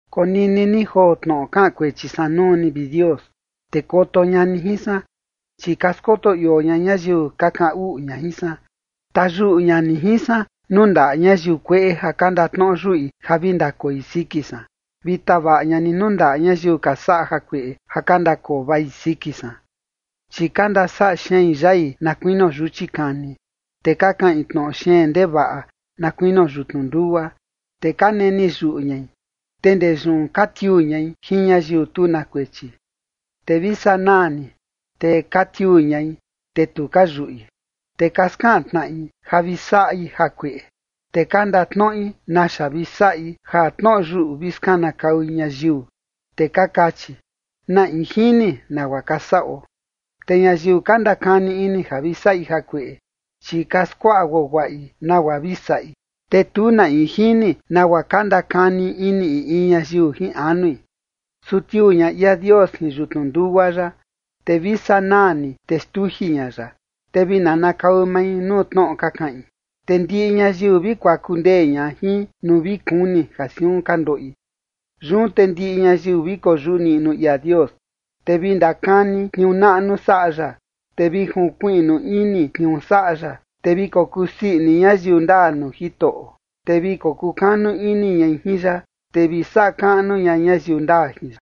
Konini ni joo tnoꞌo kaꞌan kuechi san nuu ni, vi Dios, te koto ña ni jin san, chi ka skoto ioo ña ñayiu ka kaꞌan uꞌu ña jin san. Tayuꞌu ña ni jin san nuu ndaꞌa ñayiu kueꞌe ja ka ndatnoꞌo yuꞌi ja vi ndakoi siki san, vi tavaꞌa ña ni nuu ndaꞌa ñayiu ka saꞌa jakueꞌe ja ka ndakoo vai siki san. Chi ka ndasaꞌa xein yai na kuinio yuchi kani, te ka kaꞌin tnoꞌo xeen ndevaꞌa na kuinio yutnu ndugua. Te ka neni yuꞌu ñai, te ndee yun, te ka tiuu ñai jin ñayiu tu na kuechi, te vi sanaa ni, te ka tiuu ñai, te tu ka yuꞌi. Te ka skaꞌan tnaꞌi ja vi saꞌi jakueꞌe, te ka ndatnoꞌi naxa vi saꞌi ja tnoꞌo yuꞌu vi skanakaui ñayiu, te ka kachi: ¿Na in jini nagua ka saꞌo? Te ñayiu ka ndakani ini ja vi saꞌi jakueꞌe, chi ka skuaꞌa guaguaꞌi nagua vi saꞌi, te tu na in jini nagua ka ndakani ini in in ñayiu jin anui. Su tiuu ña ia Dios jin yutnu ndugua ya, te vi sanaa ni, te xtuji ña ya. Te vi nanakau mai nuu tnoꞌo ka kaꞌin, te ndiꞌi ñayiu vi kuaku ndee ña jin nuu vi kuni ja siun ka ndoꞌi. Yun te ndiꞌi ñayiu vi koyuꞌu niꞌnu ia Dios, te vi ndakani tniuu naꞌnu saꞌa ya, te vi junkuiꞌnu ini tniuu saꞌa ya. Te vi kokusii ini ñayiu ndaa nuu Jitoꞌo, te vi kokukanu ini ñai jin ya, te vi saꞌa kaꞌnu ña ñayiu ndaa jin ya.